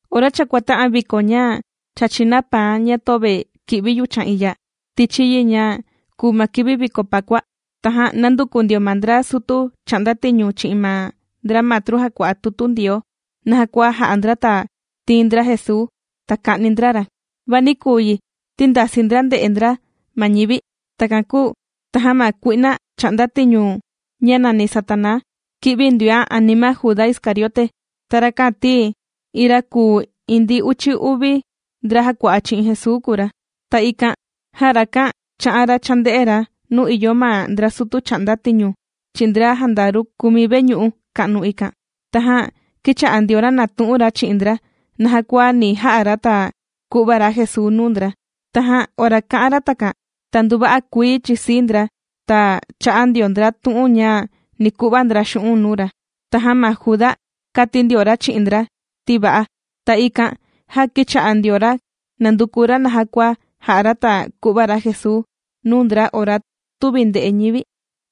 Ora cha kuàta'an viko ña chàchi na paan ña töve kì'vi yuchan iya tichi yi, ña kùu ma kivi viko pakua, tajan nànduku ndio ma ndra sutu chà'nda tiñu chi'in ma ndra matru jàkua'a tutu Ndioo naja kua ja'a ndra ta tiin ndra Jesuu ta ka'ni ndra ra. Va nī küu yi ti ndasii ndra ndè'e ndra ma ñivi. Takan kūu, tajan ma kui'na chà'nda tiñu ñá' nàni Satanaa, kī'vi ndioán' anima Juda Iscariote. Ta rakan ti iin ra kùu iin ndi uchi uvi ndra jàkua'a chi'in Jesuu kùu ra. Ta ikan jan rakan chā'an ra chānde'e ra nuu ìyo ma ndra sutu chà'nda tiñu chi'in ndra jandaru kùmi veñu'u ka'nu ikan. Tajan kīcha'a ndio ra nàtu'un ra chi'in ndra naja kua ni ja'a ra ta ku'va ra Jesuu nuu ndra. Tajan ora kā'an ra takan ta nduva'a kuii chìsii ndra ta chā'a ndio ndra tu'un ña ni ku'va ndra xu'un' nuu ra. Tajan ma Juda kāti ndio ra chi'in ndra ti va'a, ta ikan jan kīcha'a ndio ra nànduku ra naja kua ja'a ra ta ku'va ra Jesuu nuu ndra ora tüvi nde'e ñivi.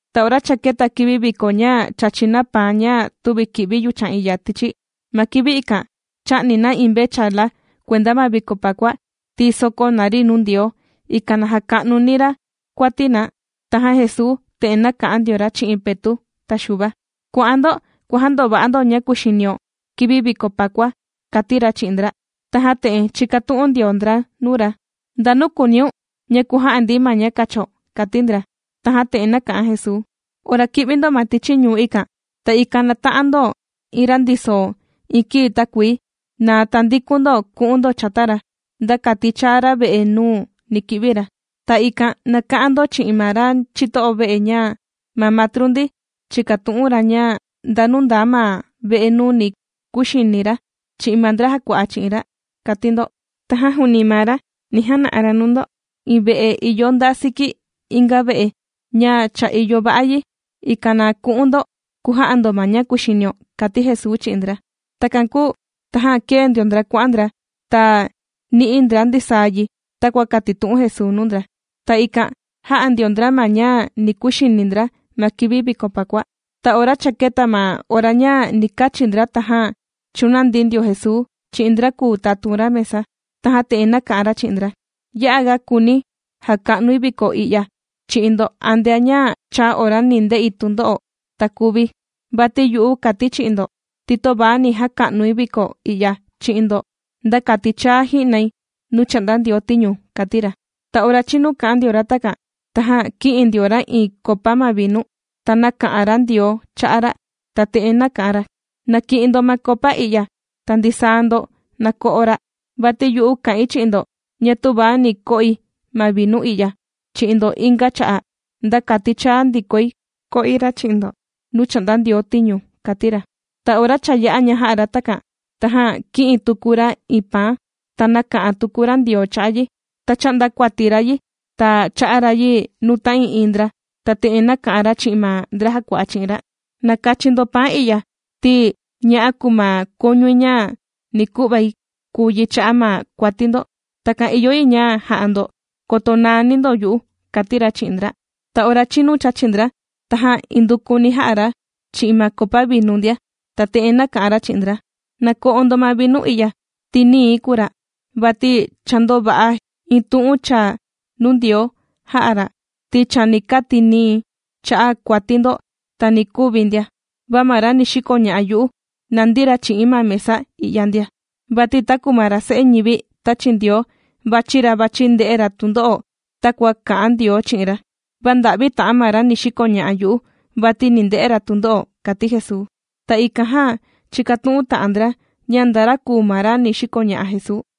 Ta ora cha kēta kivi viko ña chàchi na paan ña tüvi kì'vi yuchan iya tichi. Ma kivi ikan, chà'ni na iin mvechala kuenda ma viko pakua ti sòkó na ri nuu Ndioo, ikan na jaka'nuni ra kuati na. Tajan Jesuu te'en nāka'an ndio ra chi'in Petu' ta Xuva: ―Kua'an ndo kuàjandova'a ndo ña kuxinio kivi viko pakua ―kàti ra chi'in ndra. Tajan te'en chīkatu'un ndio ndra nuu ra: ―¿Ndanu kùuniun ña kuja'a ndi ma ña kacho? ―kàti ndra. Tajan te'en nāka'an Jesuu: ―Ora ki'vi ndo ma tichi ñuu ikan, ta ikan nata'an ndo iin ra ndiso iin kii takuii. Ta tandikun ndo ku'un ndo chata ra, nda kati chaa ra ve'e nuu ni ki'vi ra. Ta ikan na ka'an ndo chi'in ma ra chito'o ve'e ña ma matru ndi chìkatu'un ra ña ndanu ndaa ma ve'e nuu ni kuxini ra chi'in ma ndra jàkua'a chi'in ra, kàti ndo. Tajan juuni maa ra ni jana'a ra nuu ndo iin ve'e ìyo nda siki inga ve'e ña cha ìyo va'a yi, ikan na ku'un ndo kuja'a ndo ma ña kuxinio ―kàti Jesuu chi'in ndra. Takan kūu tajan kēe ndio ndra kuà'an ndra ta nī'i ndra ndisaa yi takua kātitu'un Jesuu nuu ndra, ta ikan jā'a ndio ndra ma ña ni kuxini ndra ma kivi viko Pakua. Ta ora cha kēta ma ora ña ni kachi ndra, tajan chūnandi ndio Jesuu chi'in ndra kùu tatun ra mesa, tajan te'en nāka'an ra chi'in ndra: ―¡Ya'a ga kùuni̱ jaka'nui viko i'ya chi'in ndo antea ña chàa ora ni nde'i tundo'o ta kuvi̱! Vati yu'u kàti̱ chi'in ndo ti töva ni jaka'nui viko i'ya chi'in ndo, nda kati chaa ji'nai nuu chà'nda Ndioo tiñu ―kàti ra. Ta ora chinu kā'an ndio ra takan, tajan kī'in ndio ra iin kopa ma vinu, ta nāka'an ra Ndioo cha'a' ra', ta te'en nāka'an ra: ―Na ki'in ndo ma kopa i'ya ta ndisaa ndo nako'o ra', vati yu'u kà'in chi'in ndo ña tüva ni ko'i ma vinu i'ya chi'in ndo inga cha'a', nda kati chaa ndikoi ko'i chi'in ndo nuu chà'nda Ndioo tiñu ―kàti ra. Ta ora cha yā'a ña jā'a ra takan, tajan kī'in tuku ra iin paan, ta nāka'an tuku ra Ndioo cha'a' yi, ta chā'nda kuati ra yi ta chā'a ra yi nuu ta'ii'iin ndra, ta te'en nāka'an ra chi'in ma ndra jàkua'a chi'in ra: ―Na kachi ndo paan i'ya ti ña'a kùu ma kuñui ña ni ku'vai kùu yi cha'a' ma kuati ndo. Takan ìyo yi ña ja'a ndo koto naani ndo yu'u ―kàti ra chi'in ndra. Ta ora chinu chāchi ndra, tajan indukuni jā'a ra chi'in ma kopa vinu ndia. Ta te'en nāka'an ra chi'in ndra: ―Na ko'o ndo ma vinu i'ya ti nii̱ kùu ra', vati cha ndòva'a iin tu'un chaa nuu Ndioo jā'a ra' ti chani kati̱ nii̱ cha'a' kuati ndo ta ni kuvi̱ ndia. Va ma ra ni xikoña'a yu'u nàndi ra chi'i̱n ma mesa i'ya ndia, vati taku ma ra Se'e ñivi tāchi Ndioo vàchi ra vàchi nde'e ra tundo'o takua kā'an Ndioo chi'in ra. ¡Va nda'vi ta'an ma ra ni xikoña'a yu'u, vati ni nde'e ra tundo'o! ―kàti Jesuu. Ta ikan jan chìkatu'un ta'an ndra ña nda ra kùu ma ra ni xikoña'a Jesuu.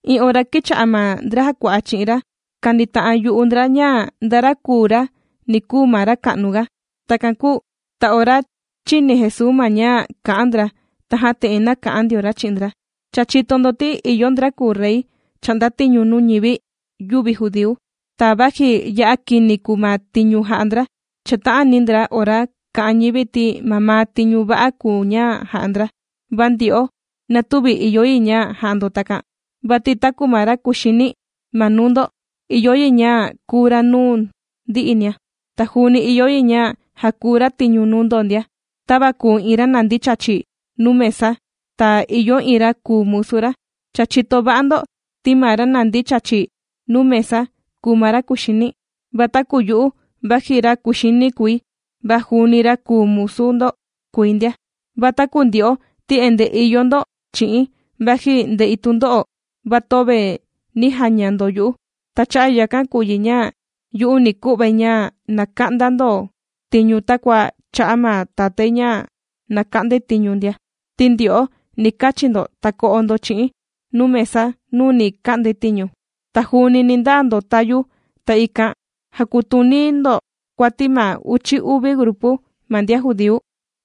Iin ora kīcha'a ma ndra jàkua'a chi'in ra kànita'an yu'u ndra ña nda ra kùu ra ni kuu ma ra ka'nuga. Takan kūu ta ora chīni Jesuu ma ña kà'an ndra, tajan te'en nāka'an ndio ra chi'in ndra: ―Cha chìto ndo ti ìyo ndra kùu rey chà'nda tiñu nuu ñivi yüvi judíu. Ta vaji ya'a jànde'e ndra tundo'o ma ñivi ora chà'nda ndra ma tiñu, va chàta'ani ndra ora kà'an ma ñivi ti mamaa tiñu va'a kùu ña ja'a ndra. Va ndyo'o, na tüvi ìyo yi ña ja'a ndo takan, vati taku ma ra kuxini ma nuu ndo ìyo yi ña kuu ra nuu ndi'inia. Ta juuni ìyo yi ña jakuu ra tiñu nuu ndo ndia. Tava kùu iin ra nàndi chàchi nuu mesa ta ìyo iin ra kùu musu ra, cha chìto va'a ndo ti ma ra nàndi chàchi nuu mesa kùu ma ra kuxini. Va taku yu'u vaji ra kuxini kùi, va juuni ra kùu musu ndo kùi ndia. ’Va taku ndyo'o ti endee ìyo ndo chi'i̱n vaji ndè'i tundo'o va töve nī jaña ndo yu'u. Ta cha'a' yakan kùu yi ña yu'u ni ku'vai ña na ka'nda ndo tiñu takua chā'a ma tatái ña na ka'ndai tiñu ndia. Ti ndyo'o ni kachi ndo ta ko'o ndo chi'i̱n nuu mesa nuu ni ka'ndai tiñu, ta juuni ni ndaa ndo tayu, ta ikan jàkutuni ndo kuati ma uchi uvi grupu ma ndian judíu.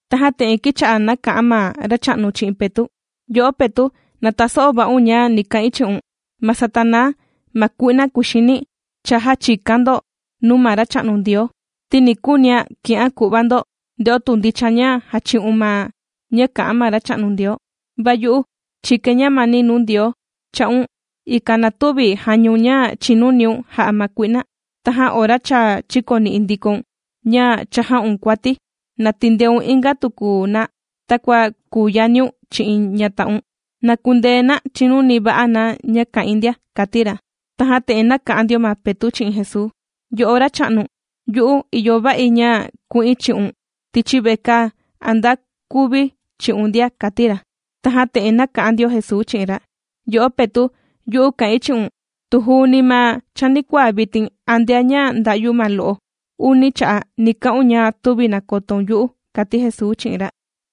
Tajan te'en kīcha'a nāka'an ma Racha'nu chi'in Petu': ―Yo'o Petu' na taso'o va'un ña ni ka'in chi'un. Ma Satanaa ma kui'na kuxini, cha jāchikán' ndo nuu ma Racha'nu Ndioo, ti kùunián' ki'án' ku'va ndo nde'o tu ndicha ña jàchi'un ma ña kà'an ma Racha'nu Ndioo, va yu'u chīkain ñamani nuu Ndioo cha'un, ikan na tüvi jañaun ña chīnuniun ja'a ma kui'na. Tajan ora cha chīkoni'i ndikoun ña cha jà'un kuati, na tindeun inga tuku na takua kùu yaniun chi'in ñata'un, na kundee na chinuni va'a na ña kà'in ndia ―kàti ra. Tajan te'en nāka'an ndio ma Petu' chi'in Jesuu: ―Yo'o Racha'nu, yu'u ìyo va'i ña ku'in chi'un tichi vekaa a nda kuvi̱ chi'un ndia ―kàti ra. Tajan te'en nāka'an ndio Jesuu chi'in ra: ―Yo'o Petu', yu'u kà'in chi'un tu juuni ma chanikuaa vitin antea ña nda'yu ma lo'o uni cha'a' ni ka'un ña tüvi nakotoun yu'u ―kàti Jesuu chi'in ra.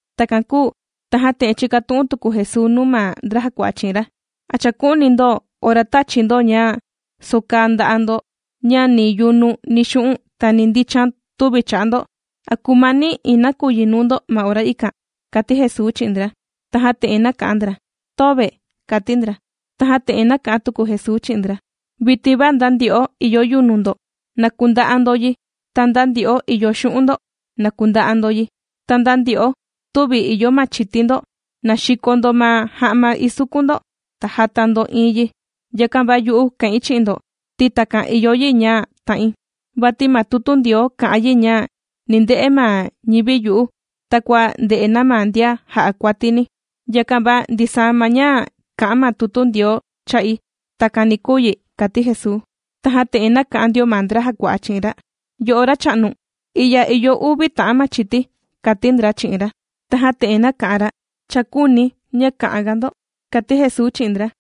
Takan kūu tajan te'en chīkatu'un tuku Jesuu nuu ma ndra jàkua'a chi'in ra: ―¿A chàku'uni ndo ora tāchi̱ ndo ña sòkaa ndà'a ndo ña ni yunu ni xu'un' ta ni ndichan tüvi cha'a ndo? ¿A kūmani iin nakuyi nuu ndo ma ora ikan? ―kàti Jesuu chi'in ndra. Tajan te'en nāka'an ndra: ―Töve ―kàti ndra. Tajan te'en nāka'an tuku Jesuu chi'in ndra: ―Vitin va nda ndyo'o ìyo yunu ndo, na kunda'a ndo yi, ta nda ndyo'o ìyo xu'un' ndo na kunda'a ndo yi, ta nda ndyo'o tüvi ìyo machiti ndo na xiko ndo ma ja'ma isukun ndo ta jata ndo iin yi. Yakan va yu'u kà'in chi'in ndo ti takan ìyo yi ña ta'in. Vati ma tutu Ndioo kà'an yi ña ni nde'e ma ñivi yu'u takua ndè'e na ma ndian jà'a kuatini. Yakan va ndisaa ma ña kà'an ma tutu Ndioo cha'i, takan ni kuu yi ―kàti Jesuu. Tajan te'en nāka'an ndio ma ndra jàkua'a chi'in ra: ―Yo'o Racha'nu, i'ya ìyo uvi ta'an machiti ―kàti ndra chi'in ra. Tajan te'en nāka'an ra: ―Cha küuni̱ ña ka'an ga ndo ―kàti Jesuu chi'in ndra.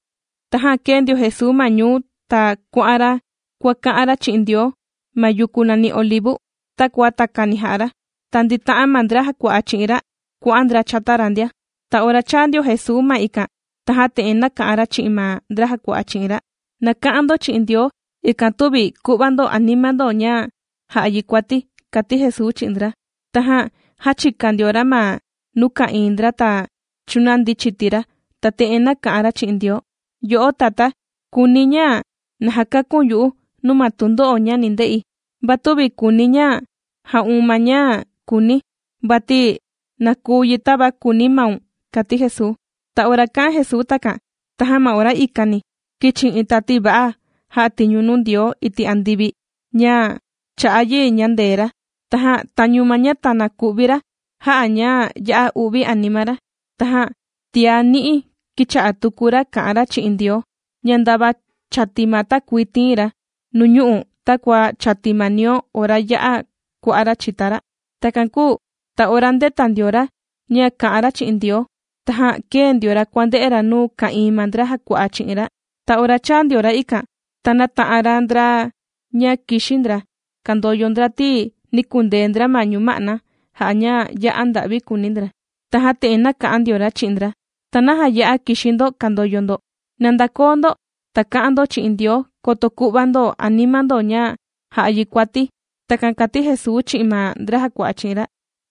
Tajan kēe ndio Jesuu ma ñuu ta kuà'an ra kuàka'an ra chi'in Ndioo ma yuku nàni Olivu, takua takani jà'a ra. Ta ndīta'an ma ndra jàkua'a chi'in ra kuà'an ndra chata ra ndia. Ta ora chāa ndio Jesuu ma ikan tajan te'en nāka'an ra chi'in ma ndra jàkua'a chi'in ra: ―Na ka'an ndo chi'in Ndioo ikan tüvi ku'va ndo anima ndo ña jà'a yi kuati ―kàti Jesuu chi'in ndra. Tajan jāchika ndio ra ma nuu ka'ìin ndra ta chūnandi chiti ra, ta te'en nāka'an ra chi'in Ndioo: ―Yo'o Tatá, kùuni̱ ña na jakaku̱n yu'u nuu ma tundo'o ña ni nde'i. Va tüvi kùuni̱ ña ja'un ma ña kùuni̱, vati na kuu yi tava kùuni maun ―kàti Jesuu. Ta ora kā'an Jesuu takan, tajan ma ora ikani kīchi iin tati va'a jà'a tiñu nuu Ndioo iti' andivi ña chā'a yi ñandee ra. Tajan tañu ma ña tana ku'vi ra jà'a ña ya'a u'vi anima ra, tajan tiá ni'i kīcha'a tuku ra kà'an ra chi'in Ndioo ña ndava chàti ma takuii tiin ra nuñu'u' takua chàti ma nio ora ya'a kua'a' ra' chìta ra'. Takan kūu ta ora ndēta ndio ra ña kà'an ra chi'in Ndioo, tajan kēe ndio ra kuànde'e ra nuu ka'ìin ma ndra jàkua'a chi'in ra. Ta ora chāa ndio ra ikan, ta nāta'an ra ndra ña kìxi ndra kàndoyo ndra, ti nī kundee ndra ma ñuma'na jà'a ña ya'a nda'vi kùuni ndra. Tajan te'en nāka'an ndio ra chi'in ndra: ―¿Ta naja ya'a kìxi ndo kàndoyo ndo? ¡Na ndakoo ndo ta ka'an ndo chi'in Ndioo, koto ku'va ndo anima ndo ña ja'a yi kuati! ―Takan kàti Jesuu chi'in ma ndra jàkua'a chi'in ra.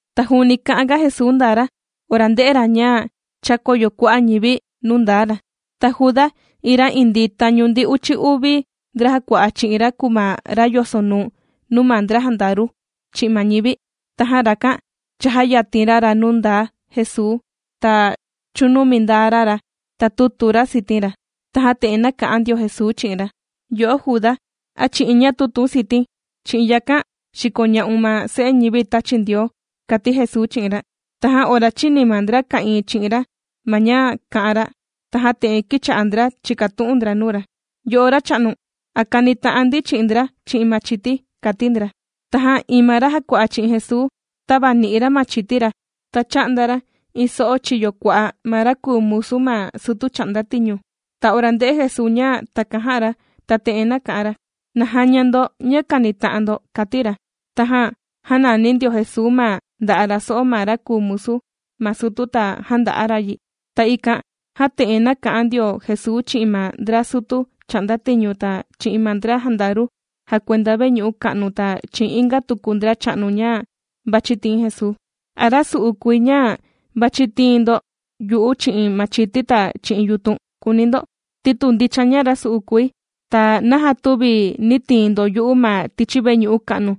Ta juuni kà'anga Jesuu ndaa ra ora ndē'e ra ña chākoyo kua'a' ñivi nuu ndaa ra. Ta Juda, iin ra indii tañu ndi uchi uvi ndra jàkua'a chi'in ra kùu ma ra yosonuu nuu ma ndra jandaru chi'in ma ñivi. Tajan, rakan chājayatin ra ra nuu ndaa Jesuu ta chūnumi ndaa ra ra, ta tūtu ra sitin ra. Tajan te'en nāka'an ndio Jesuu chi'in ra: ―Yo'o Juda, ¿a chi'in ña tùtu̱n siti̱n, chi'in yakan xìkoña'un ma Se'e ñivi tāchi Ndioo? ―kàti Jesuu chi'in ra. Tajan ora chīni ma ndra ka'ìin chi'in ra ma ña kā'an ra, tajan te'en kīcha'a ndra chìkatu'un ndra nuu ra: ―Yo'o Racha'nu, ¿a kanita'an ndi chi'in ndra chi'in machiti? ―kàti ndra. Tajan iin ma ra jàkua'a chi'in Jesuu tāvani'i ra machiti ra ta chā'nda ra iin so'o chiyo kua'a ma ra kùu musu ma sutu chà'nda tiñu. Ta ora ndē'e Jesuu ña takan jā'a ra ta te'en nāka'an ra: ―¡Na jaña ndo ña kànita'an ndo! ―kàti ra. Tajan jānani ndio Jesuu ma nda'a' ra so'o ma ra kùu musu ma sutu ta jānda'a ra yi. Ta ikan jan te'en nāka'an ndio Jesuu chi'in ma ndra sutu chà'nda tiñu ta chi'in ma ndra jandaru jàkuenda veñu'u ka'nu ta chi'in inga tuku ndracha'nu ña vàchi tiin Jesuu: ―¿A rasu'u kùi ña vàchi tiin ndo yu'u chi'in machiti ta chi'in yutun?, kùuni ndo. Ti tu ndicha ña rasu'u kùi, ta, ¿naja tüvi nī tiin ndo yu'u ma tichi veñu'u ka'nu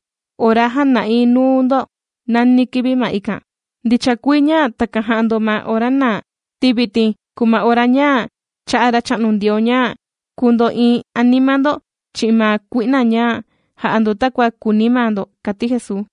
ora jāna'i nuu ndo nani kivi ma ikan? Ndicha kuii ña takan jà'a ndo ma ora naa, ti vitin kùu ma ora ña chā'a Racha'nu Ndioo ña kuu ndo'iin anima ndo chi'in ma kui'na ña jà'a ndo takua kùuni maa ndo ―kàti Jesuu.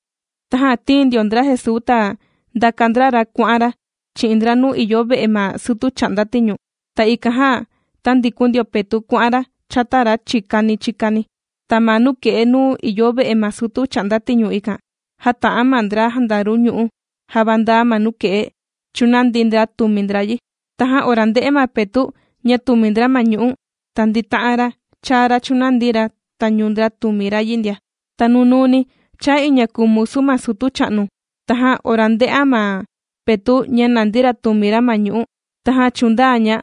Tajan tīin ndio ndra Jesuu ta ndāka ndra ra kuà'an ra chi'in ndra nuu ìyo ve'e ma sutu chà'nda tiñu. Ta ikan jan, tāndikun ndio Petu' kuà'an ra chata ra chikani chikani. Ta ma nuke'e nuu ìyo ve'e ma sutu chà'nda tiñu ikan, jāta'an ma ndra jandaru ñu'ú jàvandaa ma nuke'e chūnandi ndra tùmi ndra yi. Tajan ora ndē'e ma Petu' ña tùmi ndra ma ñu'ú, ta ndīta'an ra chāa ra chūnandi ra tañu ndra tùmi ra yi ndia. Ta nunuuni chāa iin ña kùu musu ma sutu cha'nu, tajan ora ndē'an ma Petu' ña nàndi ra tùmi ra ma ñu'ú, tajan chūndaa ña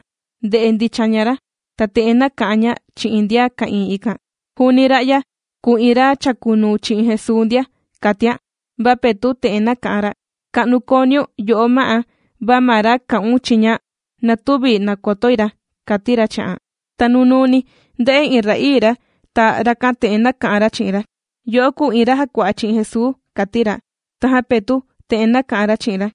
ndè'e ndicha ña ra, ta te'en nāka'an ña chi'in ndian ka'ìin ikan: ―Juuni ra'ya kùu iin ra chàkunuu chi'in Jesuu ndia ―kàtian. Va Petu' te'en nāka'an ra: ―Ka'nu kooniun yo'o ma'á, va ma ra kà'un chiña na tüvi nàkotoi ra ―kàti ra chi'an. Ta nunuuni ndē'e iin ra'ii ra, ta rakan te'en nāka'an ra chi'in ra: ―Yo'o kùu iin ra jàkua'a chi'in Jesuu ―kàti ra. Tajan Petu' te'en nāka'an ra chi'in ra: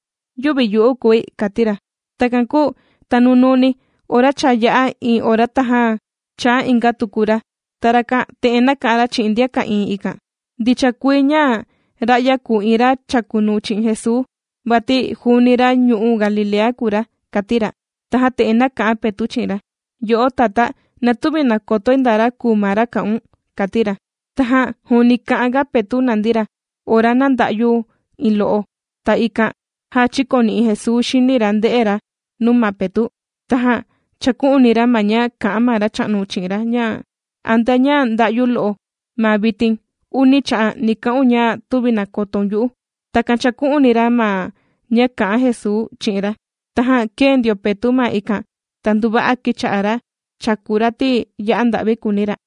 ―¡Yüvi yu'u kùi! ―kàti ra. Takan kūu ta nunuuni ora cha yā'a iin ora tajan chāa inga tuku ra, ta rakan te'en nāka'an ra chi'in ndian ka'ìin ikan: ―Ndicha kuii ña ra'ya kùu iin ra chàkunuu chi'in Jesuu vati juuni ra ñu'u' Galilea kùu ra ―kàti ra. Tajan te'en nāka'an ma Petu' chi'in ra: ―Yo'o tatá, na tüvi nàkotoi nda ra kùu ma ra kà'un ―kàti ra. Tajan juuni kà'anga Petu' nàndi ra ora nānda'yu iin lo'o. Ta ikan jan chīkoni'i Jesuu xini ra ndē'e ra nuu ma Petu', tajan chāku'uni ra ma ña kā'an ma Racha'nu chi'in ra ña: “Antea ña nda'yu lo'o ma vitin uni cha'a' ni ka'un ña tüvi nàkotoun yu'u.” Takan chāku'uni ra ma ña kā'an Jesuu chi'in ra. Tajan kēe ndio Petu' ma ikan, ta nduva'a kīcha'a ra chàku ra ti ya'a nda'vi kùuni ra.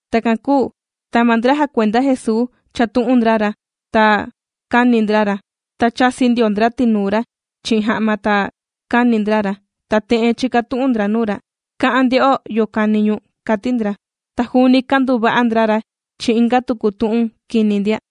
Takan kūu ta ma ndra jàkuenda Jesuu chàtu'un ndra ra ta kàni ndra ra. Ta chàsi ndio ndra tinuu ra chi'in ja'ma ta kāni ndra ra, ta te'en chìkatu'un ndra nuu ra: ―¡Ka'an, nde'o yo kàni ñu̱n! ―kàti ndra. Ta juuni kànduva'a ndra ra chi'in inga tuku tu'un kini ndia.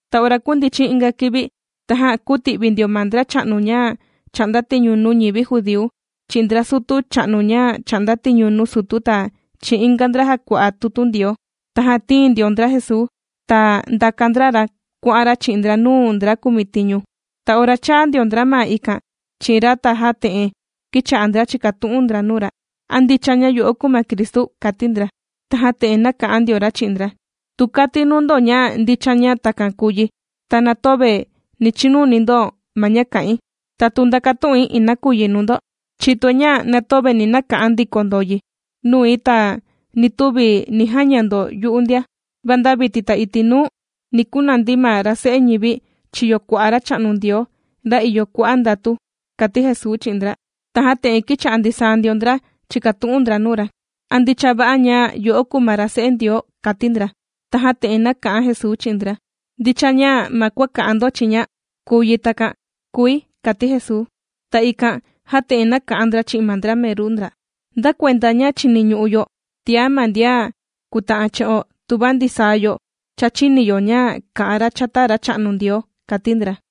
Ta ora kūndichin inga kivi tajan kūti'vi ndio ma ndracha'nu ña chà'nda tiñu nuu ñivi judíu chi'in ndra sutu cha'nu ña chà'nda tiñu nuu sutu ta chi'in inga ndra jàkua'a tutu Ndioo. Tajan tīin ndio ndra Jesuu, ta ndāka ndra ra kuà'an ra chi'in ndra nuu ndra kumitiñu. Ta ora chāa ndio ndra ma ikan chi'in ra tajan te'en kīcha'a ndra chìkatu'un ndra nuu ra: ―¿A ndicha ña yo'o kùu ma ra Cristu? ―kàti ndra. Tajan te'en nāka'an ndio ra chi'in ndra: ―Tu kati̱ nuu ndo ña ndicha ña takan kùu yi ta na töve ni chinuni ndo ma ña kà'in. Ta tu ndakatu'in iin tu'un nuu ndo, chìtoi ña na töve ni naka'an ndiko ndo yi nui, ta ni tüvi ni jaña ndo yu'u ndia, va nda vitin ta nda iti' nuu, ni kunandi ma ra Se'e ñivi chiyo kua'a Racha'nu Ndioo, ra ìyo kua'a' ndatu ―kàti Jesuu chi'in ndra. Tajan te'en kīcha'a ndisaa ndio ndra chìkatu'un ndra nuu ra: ―¿A ndicha va'a ña yo'o kùu ma ra se'e Ndioo? ―kàti ndra. Tajan te'en nāka'an Jesuu chi'in ndra: ―Ndicha kùu yi ña ma kua kà'an ndo chiña takan kùi ―kàti Jesuu. Ta ikan jan te'en nāka'an ndra chi'in ma ndra meru ndra: ―¿Nda kuenda ña chìniñu'u yo tiá ma ndian kùta'an chi'o tuva ndisaa yo cha chīni yo ña kā'an ra chata Racha'nu Ndioo? ―kàti ndra.